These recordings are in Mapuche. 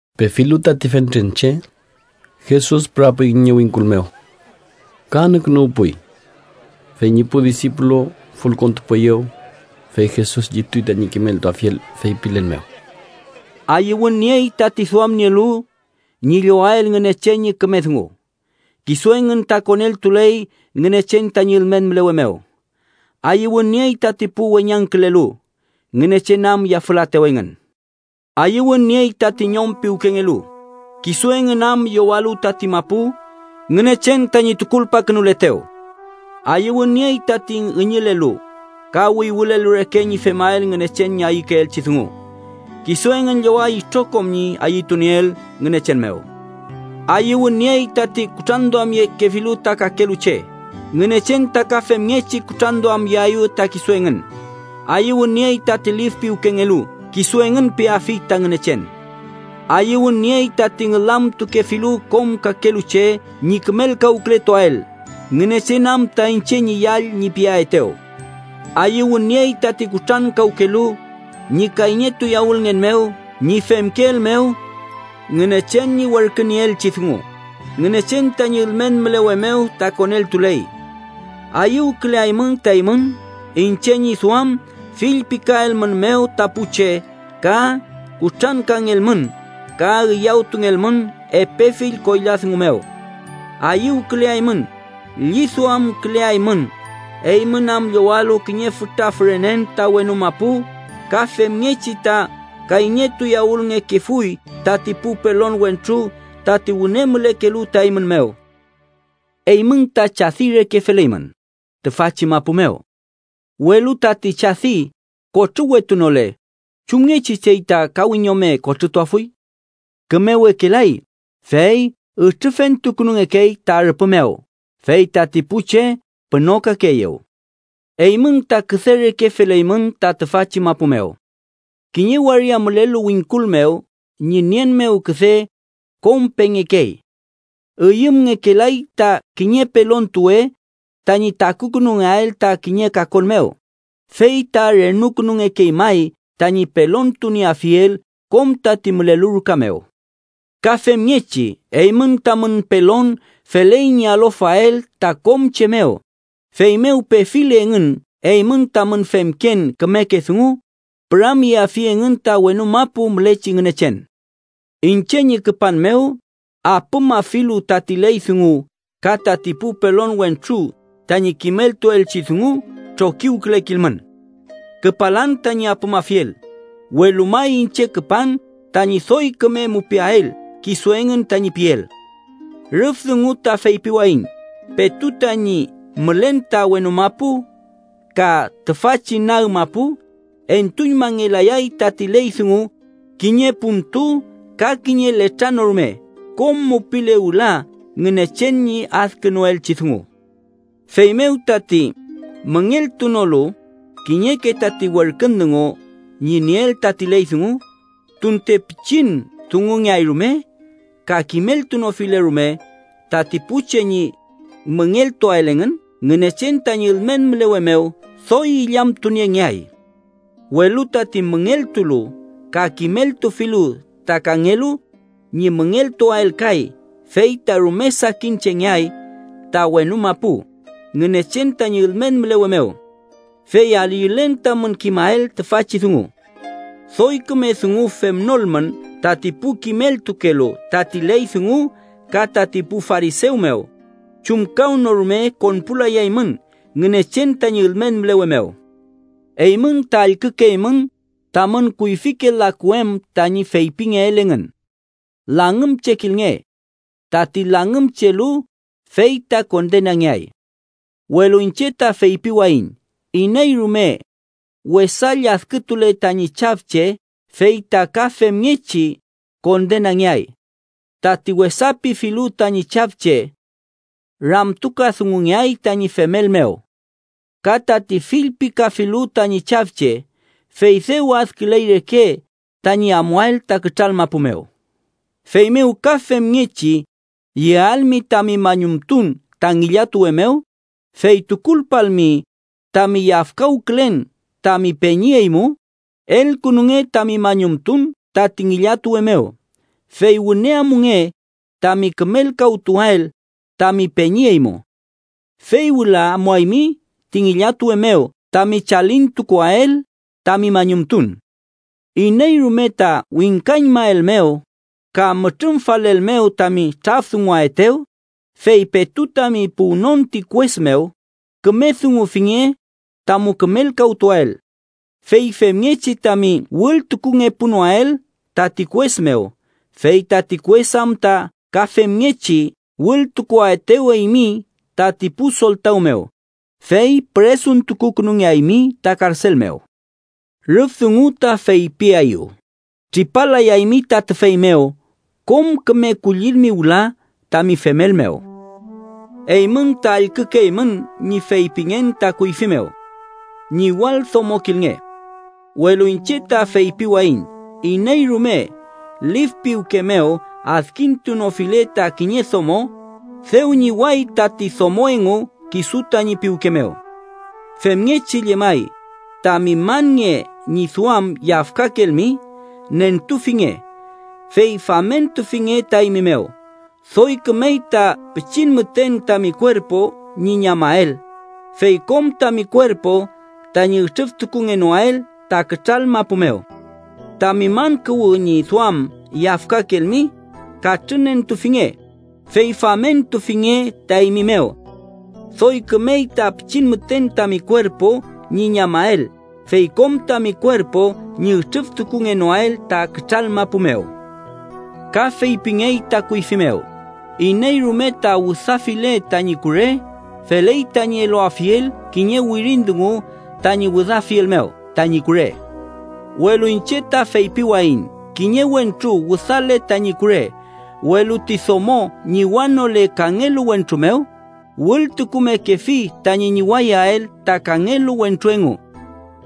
Pefilu tati fentren che, Jesus pürapuy kiñe wingkul mew ka anükünuwpuy. Fey ñi pu disipulu fülkontupueyew, fey Jesus llituy tañi kimeltuafiel, feypilen mew: “Ayüwün niey tati duamnielu ñi llowael Ngünechen ñi küme dungu, kisu engün ta koneltuley Ngünechen tañi ülmen mülewe mew. Ayüwün niey tati pu weñangkülelu, Ngünechen am yafülaetew engün. Ayüwün niey tati ñom piwkengelu, kisu engün am llowalu tati mapu Ngünechen tañi tukulpakünuletew. Ayüwün niey tati ngüñülelu ka wüywülelu reke ñi femael Ngünechen tañi ayükeelchi dungu, kisu engün lloway itrokom ñi ayütunieel Ngünechen mew. Ayüwün niey tati kutranduamyekefilu ta kakelu che, Ngünechen ta ka femngechi kutranduamyeaeyew ta kisu engün. Ayüwün niey tati lif piwkengelu, kisu engün peafi ta Ngünechen. Ayüwün niey tati ngülamtukefilu kom kakelu che ñi kümelkawkületuael, Ngünechen am ta ‘iñche ñi yall’ ñi piaetew. Ayüwün niey tati kutrankawkelu ñi kayñetuyawülngen mew ñi femkeel mew Ngünechen ñi werkünieelchi dungu, Ngünechen tañi ülmen mülewe mew ta koneltuley. Ayüwküleaymün ta eymün, iñche ñi duam fillpikaelmünmew ta pu che ka kutrankangelmün, ka üyawtungelmün epe fill koyla dungu mew. Ayüwküleaymün, lliduamküleaymün, eymün am llowalu kiñe fütra fürenen ta wenu mapu, ka femngechi ta kayñetuyawülngekefuy tati pu pelon wentru tati wüne mülekelu ta eymün mew. “Eymün ta chadi reke feleymün tüfachi mapu mew. Welu tati chadi kotrüwetunole, ¿chumngechi chey ta ka wiñome kotrütuafuy? Kümewekelay, fey ütrüfentukünungekey ta rüpü mew, fey tati pu che pünokakeeyew. “Eymün ta küde reke feleymün ta tüfachi mapu mew. Kiñe waria mülelu wingkul mew ñi nien mew küde kom pengekey, üyümngekelay ta kiñe pelontuwe tañi takukünungeael ta kiñe kakon mew, fey ta renukünungekey may tañi pelontunieafiel kom tati mülelu ruka mew. Ka femngechi, eymün tamün pelon feley ñi alofael ta kom che mew, feymew pefile engün eymün tamün femken kümeke dungu, püramyeafi engün ta wenu mapu mülechi Ngünechen. “Iñche ñi küpan mew apümafilu tati ley dungu ka tati pu pelon wentru tañi kimeltuelchi dungu trokiwkülekilmün. Küpalan tañi apümafiel, welu may iñche küpan tañi doy küme mupiael kisu engün tañi piel. Rüf dungu ta feypiwayiñ petu tañi mülen ta wenu mapu ka tüfachi nag mapu, entuñmangelayay tati ley dungu kiñe puntu ka kiñe letra no rume, kom mupile wüla Ngünechen ñi adkünuelchi dungu. Feymew, tati müngeltunolu kiñeke tati werkün dungu ñi nieel tati ley dungu, tunte pichin dungungeay rume, ka kimeltunofile rume tati pu che ñi müngeltuael engün, Ngünechen tañi ülmen mülewe mew doy illamtuniengeay. Welu tati müngeltulu ka kimeltufilu ta kangelu ñi müngeltuael kay, fey ta rume sakin chengeay ta wenu mapu, Ngünechen tañi ülmen mülewe mew. Fey ayülen tamün kimael tüfachi dungu: doy küme dungu femnolmün tati pu kimeltukelu tati ley dungu ka tati pu farisew mew, chumkawnorume konpulayaymün Ngünechen tañi ülmen mülewe mew. “Eymün ta allkükeymün tamün kuyfike laku em tañi feypingeel engün: ‘Langümchekilnge. Tati langümchelu fey ta kondenangeay.’ Welu iñche ta feypiwayiñ iney rume wesa lladkütule tañi chafche, fey ta ka femngechi kondenangeay. Tati wesa pifilu tañi chafche, ramtukadungungeay tañi femel mew. Ka tati fillpikafilu tañi chafche, fey dew adküley reke tañi amuael ta kütral mapu mew. “Feymew ka femngechi yealmi tami mañumtun ta ngillatuwe mew, fey tukulpalmi tami yafkawkülen tami peñi eymu, elkünunge tami mañumtun tati ngillatuwe mew, fey wüne amunge tami kümelkawtuael tami peñi eymu. Fey wüla amuaymi ti ngillatuwe mew tami chalintukuael tami mañumtun. “Iney rume ta wingkañmaelmew ka mütrümfalelmew tami trafdunguaetew, fey petu tami puwnon ti kues mew, küme dungufinge tamu kümelkawtuael. Fey femngechi tami wültukungepunoael tati kues mew, fey tati kues am ta ka femngechi wültukuaetew eymi tati pu soltaw mew, fey püresuntukukünungeaymi ta karsel mew. Rüf dungu ta feypiaeyu tripalayaymi ta tüfey mew kom küme kullilmi wüla tami femel mew. “Eymün ta allkükeymün ñi feypingen ta kuyfi mew: ‘Ñiwaldomokilnge.’ Welu iñche ta feypiwayiñ iney rume lif piwke mew adkintunofile ta kiñe domo, dew ñiway tati domo engu kisu tañi piwke mew. “Femngechi llemay, tami man nge ñi duam yafkakelmi, nentufinge, fey famentufinge ta eymi mew. Doy kümey ta pichin müten tami kuerpu ñi ñamael, fey kom tami kuerpu tañi ütrüftukungenoael ta kütral mapu mew. Tami man kuwü ñi duam yafkakelmi, katrünentufinge, fey famentufinge ta eymi mew. Doy kümey ta pichin müten tami kuerpu ñi ñamael, fey kom tami kuerpu ñi ütrüftukungenoael ta kütral mapu mew. “Ka feypingey ta kuyfi mew: ‘Iney rume ta wüdafile tañi kure, feley tañi eluafiel kiñe wirin dungu tañi wüdafiel mew tañi kure.’ Welu iñche ta feypiwayiñ kiñe wentru wüdale tañi kure, welu ti domo ñiwanole kangelu wentru mew, wültukumekefi tañi ñiwayael ta kangelu wentru engu.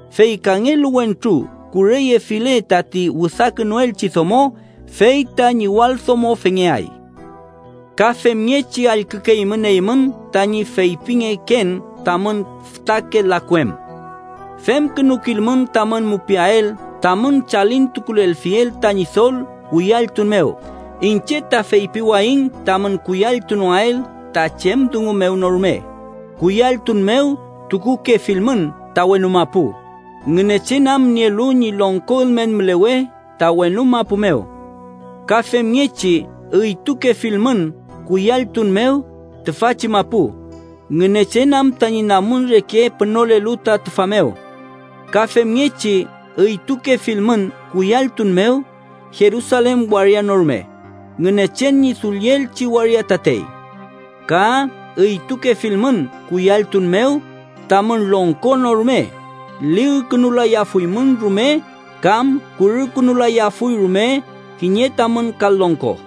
Fey kangelu wentru kureyefile tati wüdakünuelchi domo, fey ta ñiwaldomofengeay. “Ka femngechi allkükeymün eymün tañi feypingeken tamün fütake laku em: ‘Femkünukilmün tamün mupiael tamün chalintukulelfiel ta Ñidol kuyalltun mew.’ Iñche ta feypiwayiñ tamün kuyalltunoael ta chem dungu mew no rume. Kuyalltun mew tukukefilmün ta wenu mapu, Ngünechen am nielu ñi longko ülmen mülewe ta wenu mapu mew. Ka femngechi üytukefilmün kuyalltun mew tüfachi mapu, Ngünechen am tañi namun reke pünolelu ta tüfa mew. Ka femngechi üytukefilmün kuyalltun mew Jerusalen waria no rume, Ngünechen ñi dullielchi waria tatey. Ka üytukefilmün kuyalltun mew tamün longko no rume, ligkünulayafuymün rume kam kurükünulayafuy rume kiñe tamün kal longko.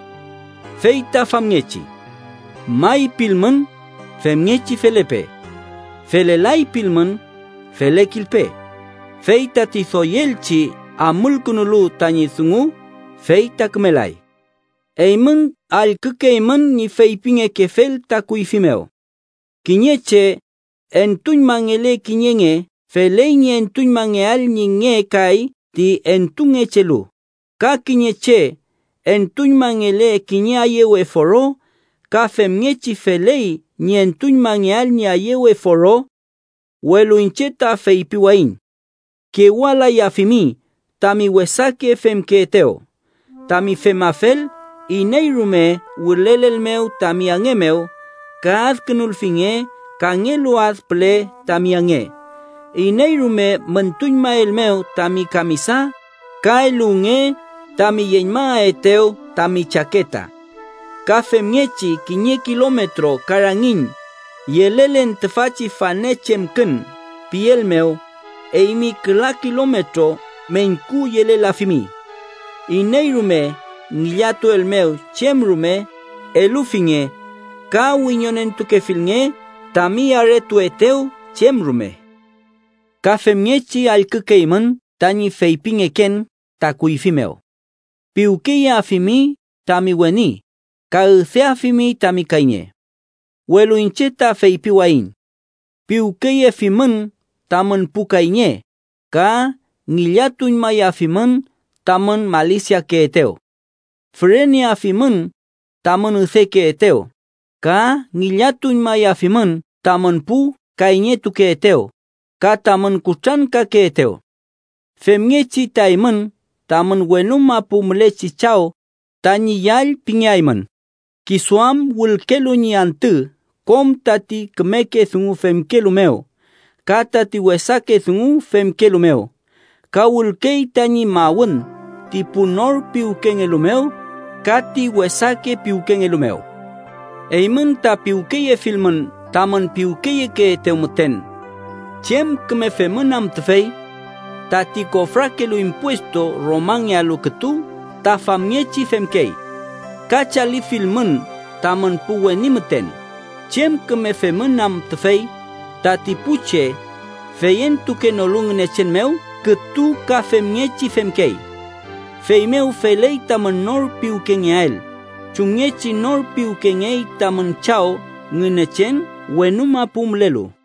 Fey ta famngechi ‘may’ pilmün, femngechi felepe. ‘Felelay’ pilmün, felekilpe, fey tati doyelchi amulkünulu tañi dungu, fey ta kümelay. “Eymün allkükeymün ñi feypingekefel ta kuyfi mew: ‘Kiñe che entuñmangele kiñe nge feley ñi entuñmangeael ñi nge kay ti entungechelu, ka kiñe che entuñmangele kiñe ayewe foro ka femngechi feley ñi entuñmangeael ñi ayewe foro.’ Welu iñche ta feypiwayiñ: kewalayafimi tami wesake femkeetew. Tami femafel, iney rume wülelelmew tami ange mew, ka adkünulfinge kangelu ad püle tami ange. Iney rume müntuñmaelmew tami kamisa, ka eluwnge tami yeñmaetew tami chaketa. Ka femngechi kiñe kilometro ka rangiñ ‘yelelen tüfachi fane chemkün’ pielmew, eymi küla kilometro meñku yelelafimi. Iney rume ngillatuelmew chem rume, elufinge ka wiñonentukefilnge tami aretuetew chem rume. “Ka femngechi allkükeymün tañi feypingeken ta kuyfi mew: ‘Piwkeyeafimi tami weni ka üdeafimi tami kayñe.’ Welu iñche ta feypiwayiñ: piwkeyefimün tamün pu kayñe ka ngillatuñmayafimün tamün malisiakeetew. Füreneafimün tamün üdekeetew ka ngillatuñmayafimün tamün pu kayñetukeetew ka tamün kutrankakeetew. Femngechi ta eymün tamün wenu mapu mülechi Chaw tañi yall pingeaymün, kisu am wülkelu ñi antü kom tati kümeke dungu femkelu mew ka tati wesake dungu femkelu mew, ka wülkey tañi mawün ti pu nor piwkengelu mew ka ti wesake piwkengelu mew. Eymün ta piwkeyefilmün tamün piwkeyekeetew müten, ¿chem küme femün am tüfey? Tati kofrakelu impuestu Romangealu kütu ta famngechi femkey. Ka chalifilmün tamün pu weni müten, ¿chem küme femün am tüfey? Tati pu che feyentukenolu Ngünechen mew kütu ka femngechi femkey. Feymew feley tamün nor piwkengeael, chumngechi nor piwkengey tamün Chaw Ngünechen wenu mapu mülelu.